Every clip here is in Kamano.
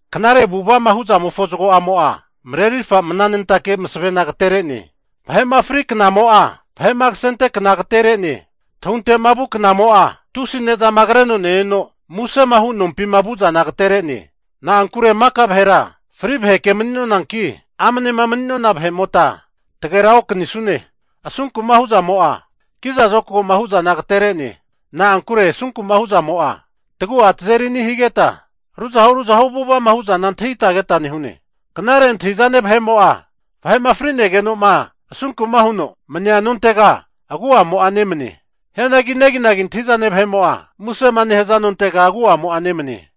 Knare avu'ava'ma hu zamofo zago'amo'a, marerirfa mnanentake masavena agatere'ne. Vahe'ma fri knamo'a, vahe'ma kasente kna agatere'ne. Tahunte'ma vu knamo'a tusi ne'zama kreno neneno musema hu nompima vu'zana agatere'ne. Na'ankure maka vahera fri vaheke mani'nonanki, amnema mani'nona vahe'mota tagera okanisune. Asunku'ma hu'zamo, kiza zokago'ma hu'zana agatere'ne. Na'ankure asunku'ma hu'zamo'a, tagu'a tazeri ani higeta, ruzahu ruzahu avu'ava'ma hu'zana antahita keta nehune. Knare antahi'zane vahe'mo'a vahe'ma fri'negeno'ma asunku'ma huno mania nontega agu'amo'a nemane. Hianagi neginagi antahi'zane vahe'mo'a musema nehaza nontega agu'amo'a nemane.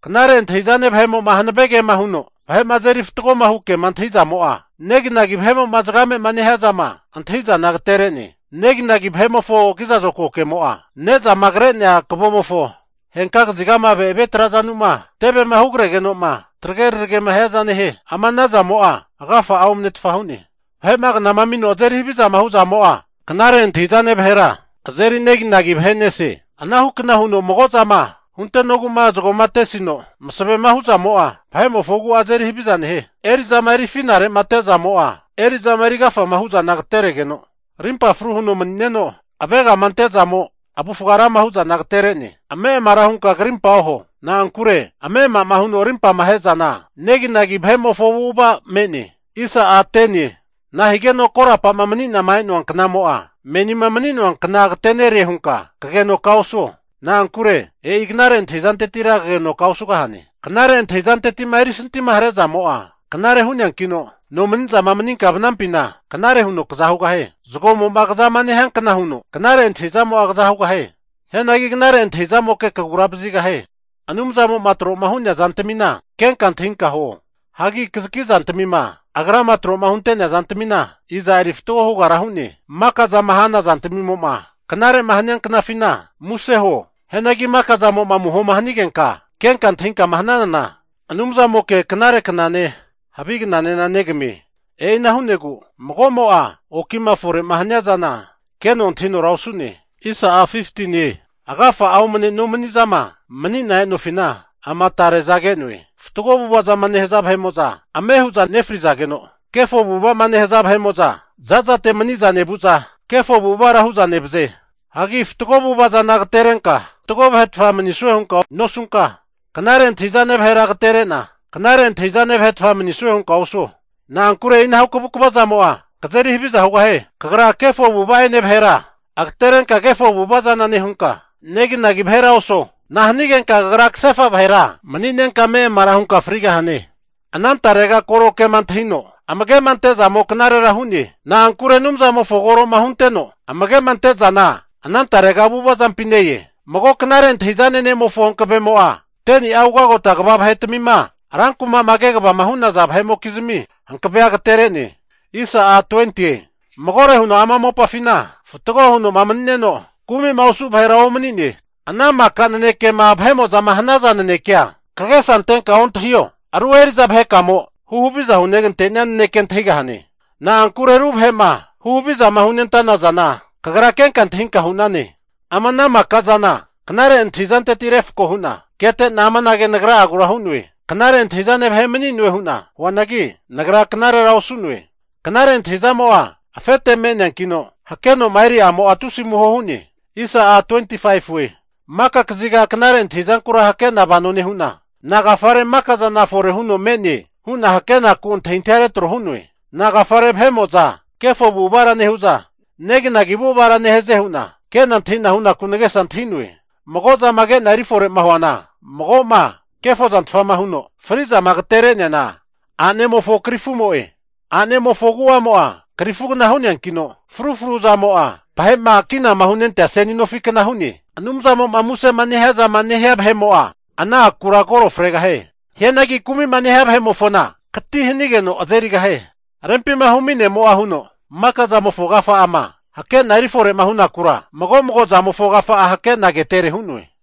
Knare antahi'zane vahe'mo'ma hanave kema huno vahe'ma azeri fatgohu kema antahi'zamo, neginagi vahe'mo'ma zagame'ma nehia zama antahi'zana agatere'ne. Neginagi vahe'mofo kiza zokago kemo'a, ne'zama kre'nea kavomofo henka kazigama ave'ave trazanuma tevema hugre'negeno'ma trage raragema hiaza nehie. Ama ana zamo'a agafa'a omnetfa hu'ne. Vahe'ma knama amino azeri havizama hu'zamo'a, knare antahi'zane vahera azeri neginagi vahe nese. Anahu kna huno mago'zama huntenogu'ma, zagoma atesino masavema hu zamo'a, vahe'mofo agu'a azeri haviza nehie. Eri'zama eri afinare'ma ate zamo, eri'zama eri agafama hu zana agateregeno, arimpa fru huno mani'neno avegama ante'zamo avufga rama hu'zana agatere'ne. Ame'amara hunka krimpa oho. Na'ankure ame'ama'ma huno arimpama ahe zana neginagi vahe'mofo avu'ava me'ne. Nahigeno korapa'ma mani'nama e'noa knamo'a, menima mani'noa kna agatere'ne hunka kagenoka osuo. Na'ankure e'i knare antahi'zantetira kagenoka osugahane. Knare antahi'zanteti'ma erisanti'ma hare'zamo'a knare hu'neankino, nomani'zama maninka vanampina knare huno kaza hugahie. Zagomo'ma kazama nehiankna huno, knare antahi'zamo'a kazahugahie. Hianagi knare antahi'zamoke kagura vazigahie. Anumzamo'ma tro'ma hu'nea zantamina kenka antahinka huo. Hagi kazaki zantamima Agrama tro'ma hunte'nea zantamina, iza eri fatgo hugara hu'ne? Maka zama hana zantmimo'ma knare'ma hania knafina, muse huo. Hianagi maka zamo'ma amuhoma hanigenka, kenka antahinkama hananana Anumzamoke knare knane, havi knanena negamie. E'ina hu'negu mago'mo'a okima fore'ma hania zana keno antahinora osu'ne. Agafa'a omane nomanizama mani'na e'nofina, ama tare'za ke'noe. Fatgo avu'ava'ma nehaza vahe'mo'za ame hu'za nefrizageno, kefo avu'ava'ma nehaza vahe'mo'za, zazate maniza nevu'za kefo avu'avara hu'za nevaze. Hagi fatgo avu'ava zana agaterenka fatgo vahetfa manisue hunka nosunka, knare antahi'zane vahera agaterena, knare antahi'zane vahetfa manisue hunka osuo. Na'ankure e'inahu kavukva zamo'a, kazeri haviza hugahie. Kagra kefo avu'ava'ene vahera agaterenka kefo avu'ava zana nehunka, neginagi vahera oso. Nahanigenka kagra kasefa vahera mani'nenka ame'amara hunka frigahane? Anantarega koro kema antahino amage'ma ante'zamo knarera hu'ne. Na'ankure Anumzamofoma koroma hunteno, amage'ma ante zana anantarega avu'avazampi ne-e. Mago knare antahi'zane ne'mofo hankavemo'a, 10ni'a ugagota kva vahetmima rankuma'ma kegavama hu'naza vahe'mokizmi hankavea agatere'ne. Magore huno ama mopafina fatgo huno'ma mani'neno kumi'ma osu vahera omani'ne. Ana maka nanekema vahe'mo'zama hanaza nanekea kagesa antenka ontahio, aru eri'za vahekamo huhaviza hugante'nia naneke antahigahane. Na'ankure aru vahe'ma hu havizama hunentana zana, kagra kenka antahinka hu'nane. Ama ana maka zana knare antahizanteti refko hu'na kete'na amanage nagra'agura hu'noe, knare antahi'zane vahe mani'nue hu'na huanagi, nagra knarera osu'noe. Knare antahi'zamo'a afete me'neankino, hakeno'ma eri'amo'a tusi amuho hu'ne. Maka kaziga knare antahi'zankura hake'na vano nehu'na, nagafare maka zana fore huno me'ne hu'na hakenaku antahintahia retro hu'noe. Nagafare vahe'mo'za kefo avu'avara nehu'za neginagi avu'avara nehaze hu'na ke'na antahi'na hunaku nagesa antahi'noe. Mago zama ke'na eri fore'ma huana, mago'ma kefo zantfa huno fri'zama agatere'neana, a'nemofo krifumo'e. A'nemofo agu'amo'a krifugna hu'neankino, fru fru azamo'a vahe'ma kinama hunentea seni nofi kna hu'ne. Anumzamo'ma musema nehiazama nehia vahe'mo'a, ana akura koro fregahie. Hianagi kumi'ma nehia vahe'mofona, kati higeno aze'nerie. Rempima humi ne'mo'a huno, maka zamofo agafa'ama hakena erifore'ma hunakura, mago mago zamofo agafa'a hakena ketere hu'noe.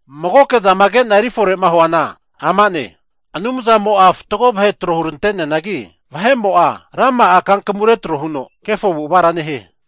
Magoke zama ke'na erifore'ma huana amane, Anumzamo'a fatgo vahe tro hunte'neanagi, vahe'mo'a rama'a kankamu retro huno kefo avu'avara nehie.